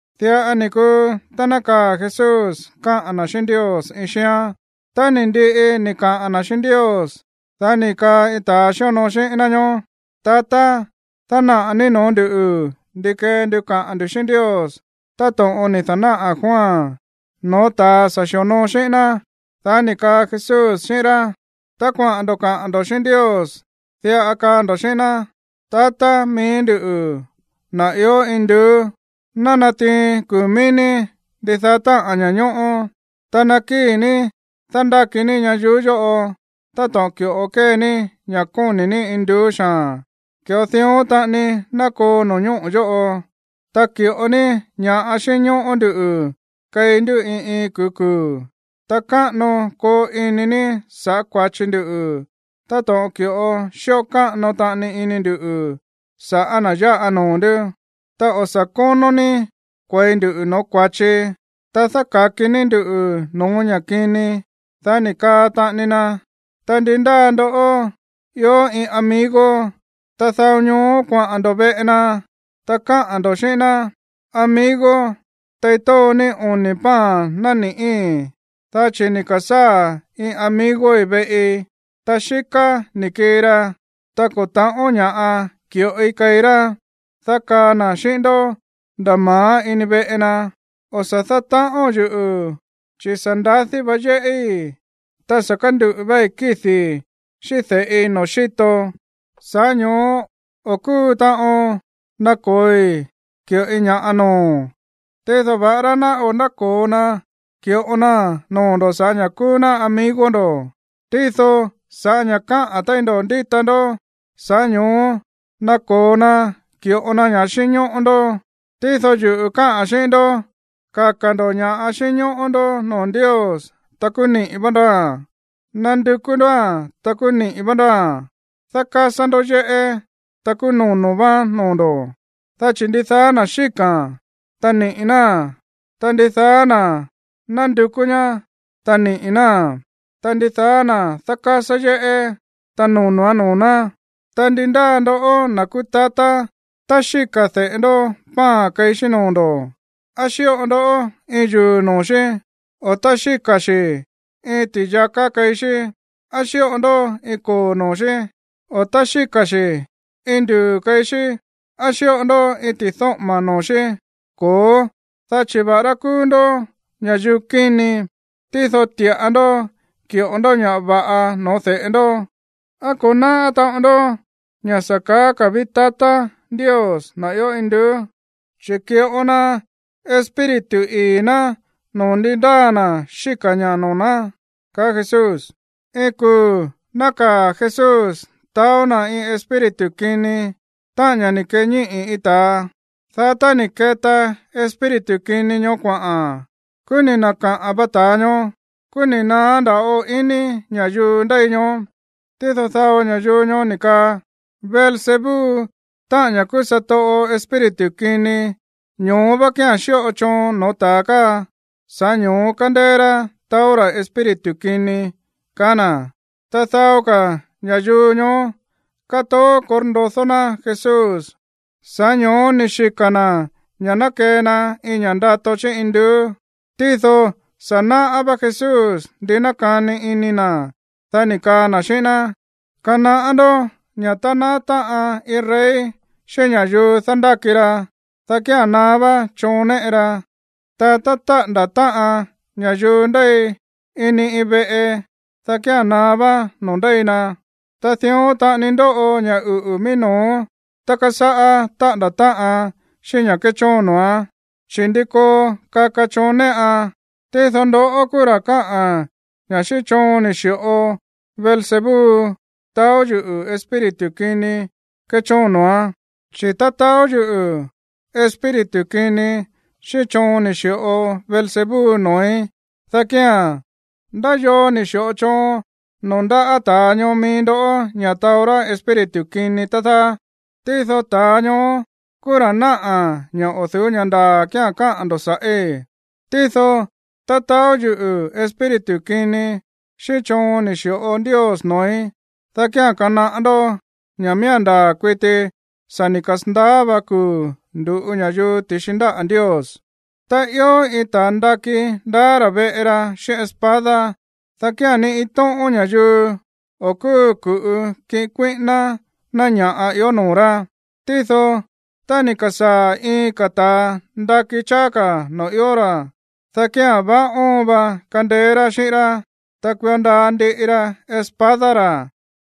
Diꞌa ni̱ kuu tá nákaa̱ Jesús káꞌa̱n na̱ xíꞌín Ndios iin xíán. Tá ni̱ ndiꞌi ni̱ kaꞌa̱n na̱ xíꞌín Ndios, dá ni̱ kaa iin ta̱a xíonoo xíꞌín ná ñóó: ―Tatá, dánaꞌa̱ ní no̱ó nduꞌu̱ ndi kee ndu kaꞌa̱n ndu̱ xíꞌín Ndios táto̱ꞌon ni̱ da̱náꞌa̱ Juan no̱ó ta̱a sa̱ xi̱onoo xíꞌín ná. Dá ni̱ kaa Jesús xíꞌín rá: ―Tá kuaꞌa̱n ndo̱ kaꞌa̱n ndo̱ xíꞌín Ndios, diꞌa kaa ndo̱ xíꞌín ná: Tatá mií nduꞌu̱, na̱ ió induú, ná natiin kuu̱ mií ní ndidaá táꞌa̱n ña̱ñóꞌó. Ta ná kii ní dándáki ní ñayuú yóꞌo. Táto̱ꞌon ki̱ꞌo kée ní ña̱ kóni̱ ní induú xaa̱n, ki̱ꞌo dión taꞌani ná koo no̱ñóꞌo̱ yóꞌo. Ta ki̱ꞌo ní ña̱ xínñóꞌó nduꞌu̱ keí ndú iin iin kuu̱ kuu̱. Ta káꞌano koo ini ní sa̱ꞌá kua̱chi ndu táto̱ꞌon ki̱ꞌo xíꞌo káꞌano taꞌani ini nduꞌu̱ sa̱ꞌá na̱ yáꞌa noo̱ ndú. Ta o̱ sa̱ kónó ní kue̱i ndu no̱ó kua̱chi, ta dáka̱ki ní nduꞌu̱ no̱ó ña̱ kini. Dá ni̱ kaa taꞌani na: ―Ta ndi ndáa ndó ió iin amigo, ta dao ñoó kuaꞌa̱n ndo̱ veꞌe na, ta káꞌa̱n ndo̱ xíꞌín ná: “Amigo, tei tóo ní oni̱ pan nani̱ꞌí, dá chi̱ ni̱ ka̱sáa̱ iin amigoi̱ veꞌi, ta xíká ni̱ kii ra, ta ko̱ ta̱ꞌón ña̱ꞌa ki̱ꞌoi keí rá.” Dá kaa na̱ xíꞌín ndó nda̱ ma̱á ini veꞌe na: “O̱ sa̱ dátaꞌóo̱n yuꞌu̱, chi̱ sa̱ ndadí vá yéꞌí, ta sa̱ kánduꞌu̱ váí kídi̱i̱ xíꞌín de̱ꞌi noo̱ xíto. Sa̱ꞌá ño̱ó o̱ kúu taꞌon nako̱oi ki̱ꞌoi ña̱ noo̱o̱n.” Tído va̱ꞌará ná o̱ náko̱o na ki̱ꞌo naa̱n noo̱ ndo̱ sa̱ꞌá ña̱ kúú ná amigo ndo̱, tído sa̱ꞌá ña̱ káꞌa̱n téí ndo̱ ndíta ndó, sa̱ꞌá ño̱ó nako̱o na ki̱ꞌo na ña̱ xínñóꞌó ndó. Tído yuꞌu̱ káꞌa̱n xíꞌín ndó, kaka̱ ndo̱ ña̱ xínñóꞌó ndó noo̱ Ndios, ta kúú niꞌi̱ vá ndóa̱n. Nandukú ndóa̱n, ta kúú niꞌi̱ vá ndóa̱n. Dákásá ndó yéꞌé, ta kúú nono̱ váán noo̱ ndo̱. Dá chi̱ ndidaá na̱ xíka̱a̱n, ta niꞌi̱ náa̱n. Ta ndidaá na̱ nándukú ñá, ta niꞌi̱ náa̱n. Ta ndidaá na̱ dákásá yéꞌé, ta nono̱án noo̱ ná. ’Ta ndi ndáa ndoꞌó, na̱ kúú tatá, tá xíka̱ de̱ꞌe ndó pan keí xí noo̱ ndo̱, ¿á xíꞌo ndó iin yuu̱ noo̱ xí? O, tá xíka̱ xi̱ iin ti̱yaká keí xí, ¿á xíꞌo ndó iin koo̱ noo̱ xí? O, tá xíka̱ xi̱ iin nduu̱ keí xí, ¿á xíꞌo ndó iin ti̱dóꞌo̱ma̱ noo̱ xí? Ko̱ó, dá chi̱ va̱ꞌará kúú ndó ña̱yuu kíni, tído ti̱ꞌa ndó ki̱ꞌo ndó ña̱ va̱ꞌa no̱ó de̱ꞌe ndó. ¿Á ko̱ náꞌá taꞌon ndó ña̱ sa̱ kaá ka̱ ví tatá Ndios, na̱ ió induú? Chi̱ ki̱ꞌo na Espíritu ii̱ ná noo̱ ndi ndáa na̱ xíka̱ ñaá noo̱ ná ―kaá Jesús. Iin kuu̱ nákaa̱ Jesús taó na̱ iin espíritu kini, táꞌa̱n ña̱ ni̱ keñíꞌi̱ iin ta̱a. Dá tá ni̱ keta espíritu kini ñoó kuaꞌa̱n, kúú ni̱ na̱kaꞌa̱n va ta̱a ñoó. Kúú ni̱ naá ndava̱ꞌo iní ña̱yuu ndéi ñoó. Tído dao ña̱yuu ñoó ni̱ kaa: ―Beelzebú, táꞌa̱n ña̱ kúú satoꞌo espíritu kini, ño̱ó vá kía̱n xíꞌo choon no̱ó ta̱a káa, sa̱ꞌá ño̱ó kándéé rá taó ra̱ espíritu kini ―kaá na̱. Ta dao ka̱ ña̱yuu ñoó kátoó korndodó ná Jesús, sa̱ꞌá ño̱ó ni̱ xika̱ na̱ ña̱ ná kee na iin ña̱ꞌa ndato chí induú. Tído sa̱ náꞌá vá Jesús ndi nákani ini na̱. Dá ni̱ kaa na̱ xíꞌín ná: ―Kanaꞌá ndó ña̱ tá naá táꞌan iin rey xíꞌín ña̱yuu dándáki ra, dá kía̱n naá vá choon néꞌe ra. Ta tá táꞌa̱nda̱ táꞌan ña̱yuu ndéi ini iin veꞌe, dá kía̱n naá vá noo̱ ndéi na. Ta dión taꞌani ndoꞌo ña̱ uꞌu̱ mií no̱ó tá kasáꞌá taꞌa̱nda̱ táꞌan xíꞌín ña̱ kéchóon noo̱án, chi̱, ¿ndi koo kaka choon néꞌan? Tído ndoꞌó kúú ra̱ káꞌa̱n ña̱ xíꞌín choon ni̱ xi̱ꞌo Beelzebú taó yuꞌu̱ espíritu kini kéchóon noo̱án. Chi̱ tá taó yuꞌu̱ espíritu kini xíꞌín choon ni̱ xi̱ꞌo Beelzebú noo̱í, dá kía̱n, ¿ndá yoo ni̱ xi̱ꞌo choon noo̱ ndáꞌa̱ ta̱ ñoo mií ndó ña̱ taó rá espíritu kini, tá dáá? Tído ta̱a ñoó kúú ra̱ náꞌa̱ ña̱ o̱ du̱ú ña̱ ndaa̱ kía̱n káꞌa̱n ndo̱ sa̱ꞌí. Tído tá taó yuꞌu̱ espíritu kini xíꞌín choon ni̱ xi̱ꞌo Ndios noo̱í, dá kía̱n kanaꞌá ndó ña̱ miía̱n ndaa̱ kuiti sa̱ ni̱ kasa̱ndaá va kuu̱ ndu̱ꞌu ña̱yuu ti̱xi ndáꞌa̱ Ndios. ’Tá ió iin ta̱a ndakí ndaá ra̱ veꞌe ra xíꞌín espada, dá kía̱n ni iin tóꞌón ña̱yuu o̱ kúu ku̱ꞌu kiꞌin kuíꞌíná ná ña̱ꞌa ió noo̱ rá. Tído tá ni̱ ka̱sáa̱ iin ka̱ ta̱a ndakí cháá ka̱ noo̱ ió ra̱, dá kía̱n vaá óon va kandeé rá xíꞌín rá, ta kuio ndaa ndiꞌi ra espada ra̱,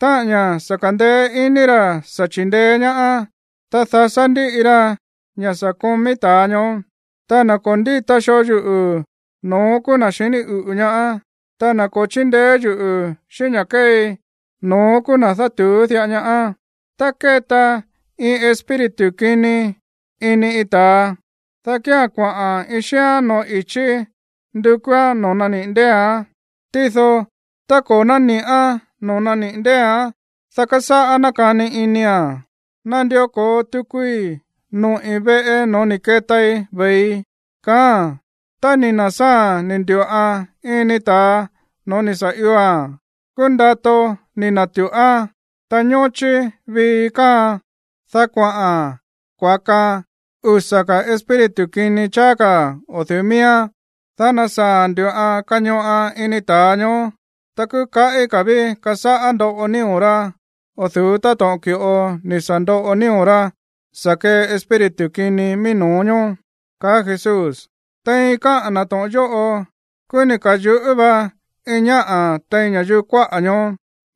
táꞌa̱n ña̱ sa̱ ka̱ndeé iní ra̱ sa̱ chindeé ñaá, ta dasá ndíꞌi ra ña̱ sa̱ komí ta̱a ñoó. Ta na̱ ko̱ ndíta xoo yuꞌu̱, no̱ón kúú na̱ xiní uꞌu̱ ñaá. Ta na̱ ko̱ chíndeé yuꞌu̱ xíꞌín ña̱ kéei, no̱ón kúú na̱ dátu̱ú diꞌa ñaá. ’Tá kéta iin espíritu kini ini iin ta̱a, dá kía̱n kuaꞌa̱n iin xíán no̱ó i̱chí ndukúán noo̱ naniꞌi̱ ndée̱án. Tído tá ko̱ náni̱ꞌán noo̱ naniꞌi̱ ndée̱án, dá kásáꞌá nákani inia̱n: “Nandió ko̱o tukui noꞌi̱ veꞌe no̱ó ni̱ ketai ve̱ii”, kaáa̱n. Tá ni̱ na̱sáa̱a̱n ni̱ ndu̱ꞌan ini ta̱a no̱ó ni̱ sa̱ ioa̱n, kúú ndato ni̱ na̱tuꞌán, ta ñóchí vii káaan. Dá kuaꞌa̱n kuakaan usa̱ ka̱ espíritu kini cháá ka̱ o̱ du̱ú miíán, dá nasaa̱a̱n ndu̱ꞌan kañoꞌan ini ta̱a ñoó. Ta kúú kaꞌí ka̱ ví kasáꞌá ndoꞌo nío̱ rá o̱ du̱ú táto̱ꞌon ki̱ꞌo ni̱ sa̱ ndoꞌo nío̱ rá sa̱ kee espíritu kini mií no̱ó ñoó ―kaá Jesús. Tein káꞌa̱n na̱ to̱ꞌon yóꞌo, kúú ni̱ ka̱yuꞌú vá iin ñáꞌa̱ tein ña̱yuu kuáꞌa̱ ñoó: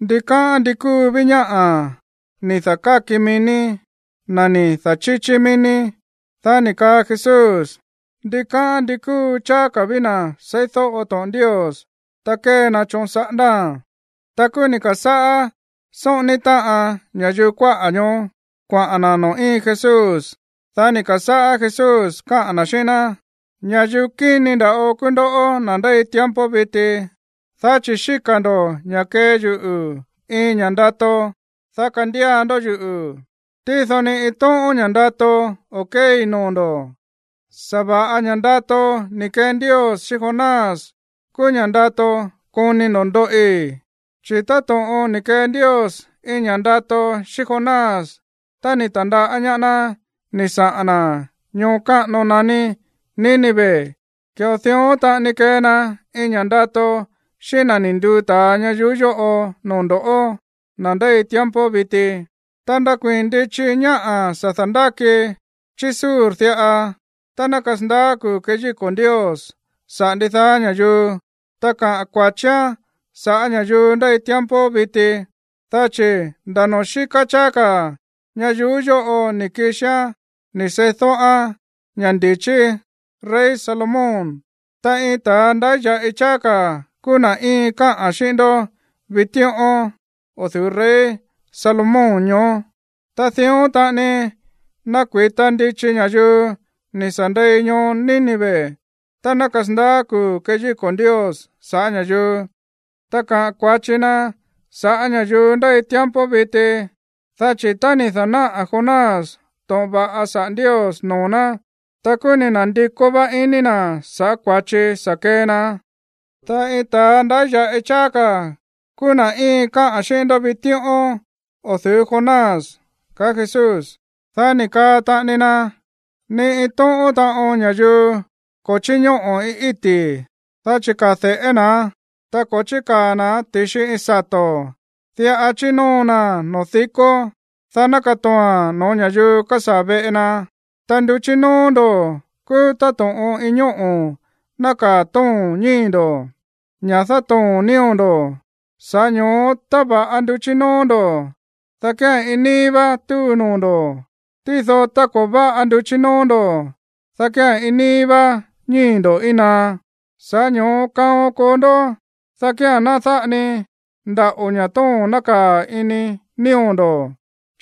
―Ndikáꞌán ndi kúu ví ñáꞌa̱ ni̱ da̱káki mií ní, na̱ ni̱ da̱chíchí mií ní. Dá ni̱ kaa Jesús: ―Ndikáꞌán ndi kúu cháá ka̱ ví na̱ seídóꞌo to̱ꞌon Ndios, ta kée na choon saꞌándáa̱n. Ta kúú ni̱ ka̱sáꞌá sóꞌóní táꞌan ña̱yuu kuáꞌa̱ ñoó kuaꞌa̱n na̱ noo̱ íin Jesús. Dá ni̱ ka̱sáꞌá Jesús káꞌa̱n na̱ xíꞌín ná: ―Ña̱yuu kíni nda̱ꞌo kúú ndoꞌó, na̱ ndéi tiempo viti, dá chi̱ xíka̱ ndo̱ ña̱ kee yuꞌu̱ iin ña̱ ndato, dá kandía ndó yuꞌu̱. Tído ni iin tóꞌón ña̱ ndato o̱ kéei noo̱ ndo̱, sa̱va̱ꞌa ña̱ ndato ni̱ kee Ndios xíꞌín Jonás kúú ña̱ ndato koni ndo̱ ndoꞌi. Chi̱ táto̱ꞌon ni̱ kee Ndios iin ña̱ ndato xíꞌín Jonás tá ni̱ ta̱ndaꞌá ñaá ná ni̱ saꞌa̱n na̱ ñoo káꞌano naní Nínive, ki̱ꞌo dión taꞌani kee na iin ña̱ ndato xíꞌín na̱ ni̱ nduu ta̱a ñayuú yóꞌo noo̱ ndo̱ꞌó, na̱ ndéi tiempo viti. ’Ta nakuii̱n ndichi ñáꞌa̱ sa̱ da̱ndáki chí Sur diꞌa tá ná kasandaá kuu̱ keyíko̱ Ndios saꞌa̱ ndidaá ña̱yuu, ta kaꞌa̱n kua̱chián sa̱ꞌá ña̱yuu ndéi tiempo viti, dá chi̱ nda̱ noo̱ xíká cháá ka̱ ñayuú yóꞌo ni̱ kixián ni̱ seídóꞌán ña̱ ndi̱chí rey Salomón. Ta iin ta̱a ndáya̱ꞌi cháá ka̱ kúú na̱ íin káꞌa̱n xíꞌín ndó vitíꞌón o̱ du̱ú rey Salomón ñoó. Ta dión taꞌani nakui̱ta ndichi ña̱yuu ni̱ sa̱ ndei ñoo Nínive tá ná kasandaá kuu̱ keyíko̱ Ndios sa̱ꞌá ña̱yuu, ta kaꞌa̱n kua̱chi na sa̱ꞌá ña̱yuu ndéi tiempo viti. Dá chi̱ tá ni̱ da̱náꞌa̱ Jonás to̱ꞌon va̱ꞌa saꞌa̱ Ndios noo̱ ná, ta kúú ni̱ na̱ndikó vá iní na̱ sa̱ꞌá kua̱chi sa̱ kee na. Ta iin ta̱a ndáya̱ꞌi cháá ka̱ kúú na̱ íin káꞌa̱n xíꞌín ndó vitíꞌón o̱ du̱ú Jonás ―kaá Jesús. Dá ni̱ kaa taꞌani na: ―Ni iin tóꞌón taꞌon ña̱yuu ko̱ chíñóꞌo̱ iin íti̱, dá chikaa̱ de̱ꞌé na̱án, ta ko̱ chíkaa̱ na̱án ti̱xi iin sato̱. Diꞌa chínóo naa̱n noo̱ dikó, dá ná katoo̱a̱n no̱ó ña̱yuu kásaa̱ veꞌe na. Ta nduchí nóó ndo̱ kúú táto̱ꞌon iin ñóꞌo̱ nákaa̱ tóo̱n ñíi̱ ndo̱, ña̱ dátoo̱n nío̱ ndo̱. Sa̱ꞌá ño̱ó tá va̱ꞌa nduchí nóó ndo̱, dá kía̱n iin níí vá túu noo̱ ndo̱. Tído tá ko̱ váꞌa nduchí nóó ndo̱, dá kía̱n iin níí vá ñíi̱ ndo̱ íin naá. Sa̱ꞌá ño̱ó kaon koo ndó, dá kía̱n ná dáꞌa ni ndaꞌo̱ ña̱ tóo̱n nákaa̱ ini nío̱ ndo̱,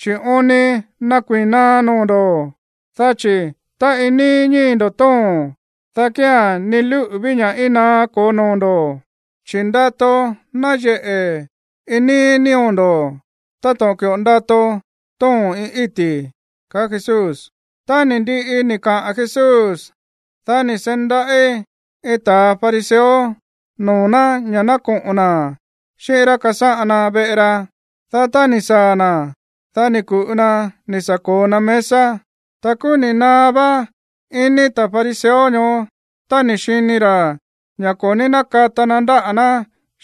chi̱ oon ni nakuii̱n naá noo̱ ndo̱. Dá chi̱ tá iin níí ñíi̱ ndo̱ tóo̱n, dá kía̱n ni lúꞌu̱ ví ña̱ íin naá koo noo̱ ndo̱, chi̱ ndato náyeꞌe̱ iin níí nío̱ ndo̱, táto̱ꞌon ki̱ꞌo ndato tóo̱n iin íti̱ ―kaá Jesús. Tá ni̱ ndiꞌi ni̱ kaꞌa̱n Jesús, dá ni̱ seí ndaꞌí iin ta̱ fariseo noo̱ ná ña̱ ná koꞌo̱n na̱ xíꞌín rá kasáꞌan na veꞌe ra. Dá tá ni̱ saa̱ na̱, dá ni̱ ku̱ꞌu na ni̱ sa̱ ko̱o na mesa. Ta kúú ni̱ naá vá iní ta̱ fariseo ñoó tá ni̱ xini ra̱ ña̱ ko̱ ní nákata na ndáꞌa̱ ná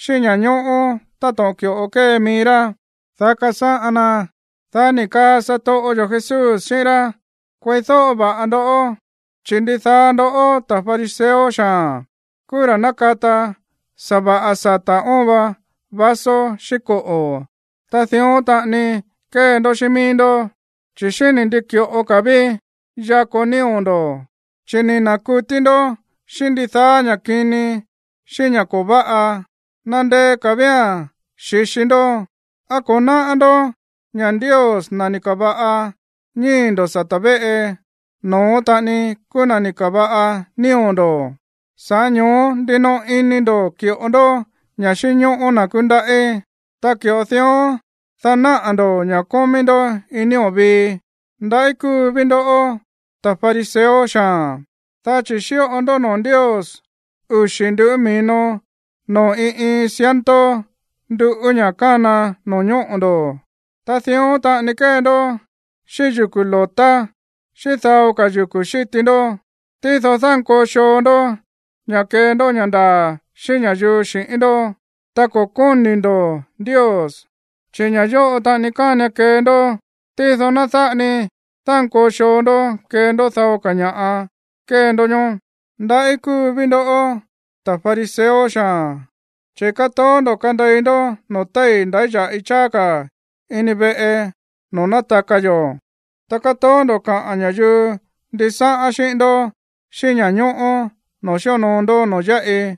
xíꞌín ña̱ñóꞌó táto̱ꞌon ki̱ꞌo kée mií rá, dá kasáꞌan na. Dá ni̱ kaa satoꞌo yo̱ Jesús xíꞌín rá: ―Kueídóꞌo va̱ꞌa ndó, chi̱ ndidaá ndoꞌó, ta̱ fariseo xaa̱n, kúú ra̱ nákata sa̱va̱ꞌa sata̱ óon va vaso xíꞌín koꞌo̱. Ta dión taꞌani kée ndó xíꞌín mií ndó, chi̱ xíni̱ ndi ki̱ꞌo ka̱ ví yakó nío̱ ndo̱, chi̱ ni̱ na̱kutí ndó xíꞌín ndidaá ña̱ kini xíꞌín ña̱ ko̱ váꞌa. ¡Nandeé ka̱ vía̱n xi̱xi ndó! ¿Á ko̱ náꞌá ndó ña̱ Ndios, na̱ ni̱ ka̱va̱ꞌa ñíi̱ ndo̱ sata̱ véꞌe, no̱ón taꞌani kúú na̱ ni̱ ka̱va̱ꞌa nío̱ ndo̱? Sa̱ꞌá ño̱ó ndinoꞌo ini ndo̱ ki̱ꞌo ndó ña̱ꞌa xínñóꞌó na̱ kúndaꞌí, ta ki̱ꞌo dión, dá naꞌa̱ ndo̱ ña̱ kómí ndó iin nío̱ vií. ’Ndaꞌí kúu ví ndo̱ꞌó, ta̱ fariseo xaa̱n, dá chi̱ xíꞌo ndó noo̱ Ndios uxi̱ nduꞌú mi̱no noo̱ iin iin ciento nduꞌú ña̱ kána no̱ñóꞌo̱ ndo̱. Ta dión taꞌani kée ndó xíꞌín yuku̱ lo̱tá xíꞌín dao ka̱ yuku̱ xíti ndó. Tído dánkoo xoo ndó ña̱ kee ndó ña̱ ndaa̱ xíꞌín ña̱yuu xi̱ꞌín ndó, ta ko̱ kóni̱ ndo̱ Ndios. Chi̱ ña̱ yóꞌo taꞌani kánian kee ndó, tído ná dáꞌa ni dánkoo xoo ndó kee ndó dao ka̱ ña̱ kée ndó ñoó. Ndaꞌí kúu ví ndo̱ꞌó, ta̱ fariseo xaa̱n, chi̱ kátoó ndo̱ kánde̱i ndó noo̱ téi̱ ndáya̱ꞌi cháá ka̱ ini veꞌe noo̱ nátaka yo̱, ta kátoó ndo̱ kaꞌa̱n ña̱yuu ndisáꞌán xíꞌín ndó xíꞌín ña̱ñóꞌó noo̱ xíonoo ndó noo̱ yáꞌi.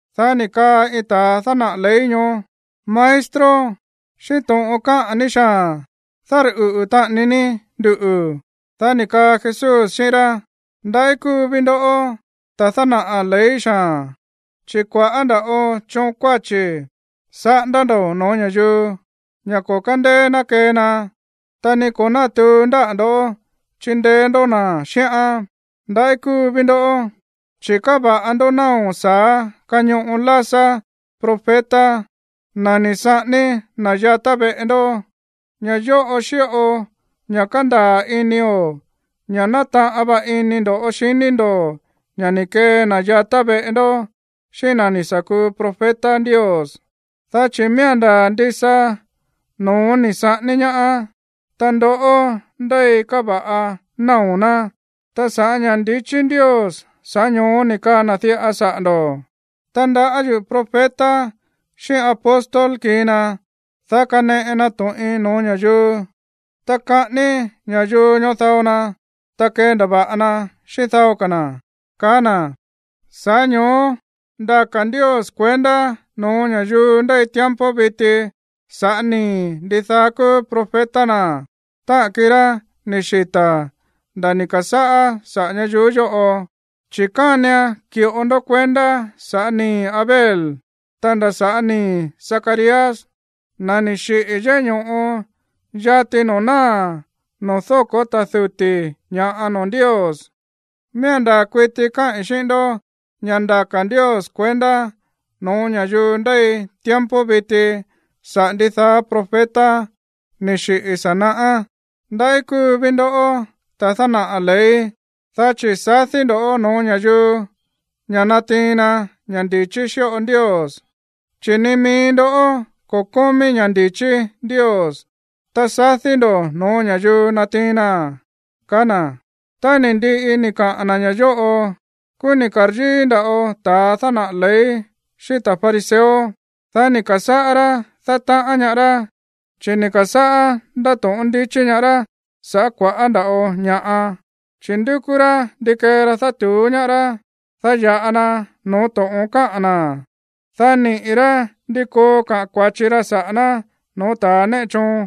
Dá ni̱ kaa iin ta̱ dánaꞌa̱ ley ñoó: ―Maestro, xíꞌín to̱ꞌon káꞌa̱n ní xaa̱n dárꞌuꞌu̱ taꞌani ní nduꞌu̱. Dá ni̱ kaa Jesús xíꞌín rá: ―Ndaꞌí kúu ví ndo̱ꞌó, ta̱ dánaꞌa̱ ley xaa̱n, chi̱ kua̱ꞌá ndava̱ꞌo choon kuáchi̱ saꞌándá ndo̱ no̱ó ña̱yuu, ña̱ ko̱ kándeé ná kee na, ta ni ko̱ nátuu ndáꞌa̱ ndo̱ chindeé ndó na̱ xíꞌán. Ndaꞌí kúu ví ndo̱ꞌó, chi̱ káva̱ꞌa ndó náo̱ sa̱á kañoꞌo lásá profeta, na̱ ni̱ saꞌání na̱ yatá veꞌe ndó. Ña̱ yóꞌo xíꞌo ña̱ kándaa̱ inio̱ ña̱ nátaꞌan vá ini ndo̱ xiní ndo̱ ña̱ ni̱ kee na̱ yatá veꞌe ndó xíꞌín na̱ ni̱ sa̱ kuu profeta Ndios, dá chi̱ miía̱n ndaa̱ ndisa no̱ón ni̱ saꞌání ñaá, ta ndoꞌó ndéi káva̱ꞌa náo̱ ná. Ta sa̱ꞌá ña̱ ndi̱chí Ndios, sa̱ꞌá ño̱ó ni̱ kaa na̱ diꞌa saꞌa̱ ndo̱: “Tandaꞌá yuꞌu̱ profeta xíꞌín apóstol kii na, dá kaneꞌe na to̱ꞌin no̱ó ña̱yuu. Ta kaꞌání ña̱yuu ñoó dao na, ta kendava̱ꞌa na xíꞌín dao ka̱ na̱”, kaá na̱. Sa̱ꞌá ño̱ó ndaka̱ Ndios kuendá no̱ó ña̱yuu ndéi tiempo viti sa̱ꞌá nii̱ ndidaá kúú profeta na̱, táꞌa̱n kirá ni̱ xita̱ nda̱ ni̱ ka̱sáꞌá saꞌa̱ ñayuú yóꞌo. Chi̱ kánian ki̱ꞌo ndó kuendá sa̱ꞌá nii̱ Abel, ta nda̱ sa̱ꞌá nii̱ Zacarías, na̱ ni̱ xiꞌi̱ yéꞌé ño̱ꞌo, yati noo̱ náa̱ noo̱ dóko̱ ta̱ duti̱ ña̱ꞌa noo̱ Ndios. Miía̱n ndaa̱ kuiti káꞌi̱n xíꞌín ndó ña̱ ndaka̱ Ndios kuendá no̱ó ña̱yuu ndéi tiempo viti saꞌa̱ ndidaá profeta ni̱ xiꞌi̱ sa̱ naꞌá. ’Ndaꞌí kúu ví ndo̱ꞌó, ta̱ dánaꞌa̱ ley, dá chi̱ sadí ndo̱ no̱ó ña̱yuu ña̱ natiin na ña̱ ndichí xíꞌo Ndios, chi̱ ni mií ndó ko̱ kómí ña̱ ndi̱chí Ndios, ta sadí ndo̱ no̱ó ña̱yuu natiin naa̱n ―kaá na̱. Tá ni̱ ndiꞌi ni̱ kaꞌa̱n na̱ ña̱ yóꞌo, kúú ni̱ ka̱ryíí nda̱ꞌo ta̱ dánaꞌa̱ ley xíꞌín ta̱ fariseo. Dá ni̱ ka̱sáꞌá rá dátaꞌán ñaá rá, chi̱ ni̱ ka̱sáꞌá ndáto̱ꞌón ndichí ñaá rá sa̱ꞌá kua̱ꞌá nda̱ꞌo ña̱ꞌa, chi̱ ndúkú rá ndi kee ra dátu̱ú ñaá rá, dá ya̱ꞌa na no̱ó to̱ꞌon káꞌa̱n na̱, dá niꞌi̱ rá ndi koo kaꞌa̱n kua̱chi ra saꞌa̱ ná no̱ó ta̱ néꞌe choon.